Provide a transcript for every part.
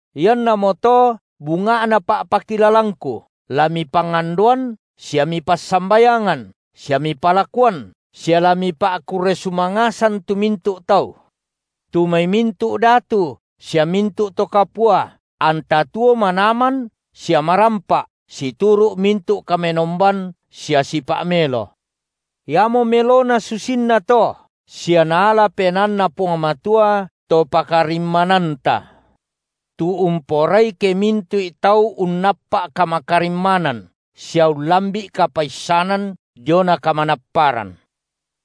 Iannamoto bunga’na pa’pakilalangku, la mipangandoan sia mipassambayangan sia mipalakuan sia la mipa’kurre sumangasan tu mintu’ tau; tu mai mintu’ datu sia mintu’ to kapua, anta tuo manaman sia marampa’ situru’ mintu’ kamenomban sia sipa’ melo. Iamo melona susinna to sia naala penaanNa Puang Matua, Topakarimma- nanta, tu umporai ke mintu’i tau unnappa’ kamakarimmanan sia ullambi’ kapaissanan diona kamanapparan.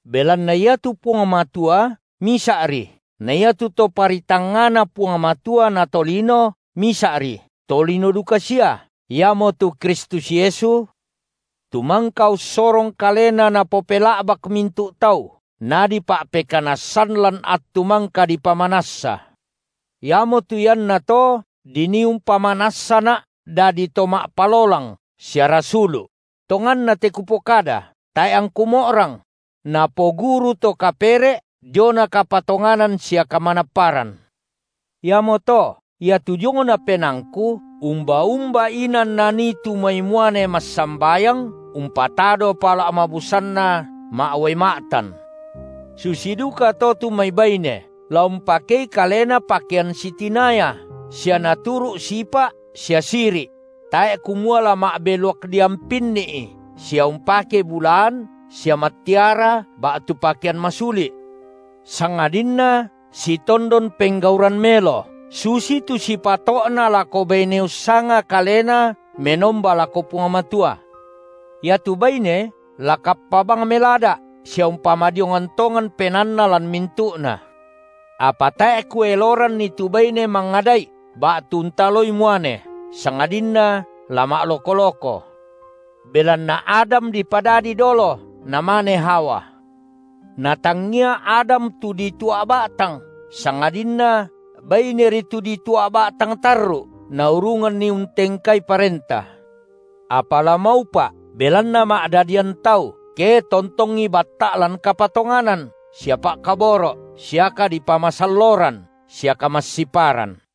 Belanna iatu Puang Matua Misa’ri, na iatu ToparitangngaNa Puang Matua na tolino Misa’ri, tolino duka sia, iamotu Kristus Yesu, tu mangka ussorong Kalena napopela’bak mintu’ tau, nadipa’pekanassan lan attu mangka dipamanassa. Iamotu iannato dinii umpamanassana’ dadi to ma’palolang sia rasulu’ – tonganna te kupokada, tae’ angku mo’rang –, napoguru to kapere’ diona kapatonganan sia kamanapparan. Iamoto, iatu diongna penaangku, umba-umba inan nanii tu mai muane massambayang, umpatado pala’ mabusanna ma’uai ma’tan. Susi dukato tu mai baine la umpakei kalena pakean sitinaya sia naturu’ sipa’ sia siri’; tae’ kumua la ma’beluak diampinni’i sia umpake bulaan sia mattiara ba’tu pakean masuli’; sangadinna sitondon penggauran melo, susitu sipato’na lako baine ussanga kalena menomba lako Puang Matua. Iatu baine la kappa bang melada’ sia umpamadiongan tongan penaanna lan mintu’na. Apa tae’ kueloranni tu baine mangada’i ba’tu untaloi muane, sangadinna la ma’loko-loko. Belanna Adam dipadadi dolo, namane Hawa. Na tangia Adam tu ditua’ ba’tang, sangadinna baineri tu ditua’ ba’tang tarru’, naurunganni untengkai parenta. Apa la maupa’, belanna ma’dadian tau, ke tontongi batta’ lan kapatonganan sia pa’kaboro’ sia kadipamasalloran sia kamassiparan.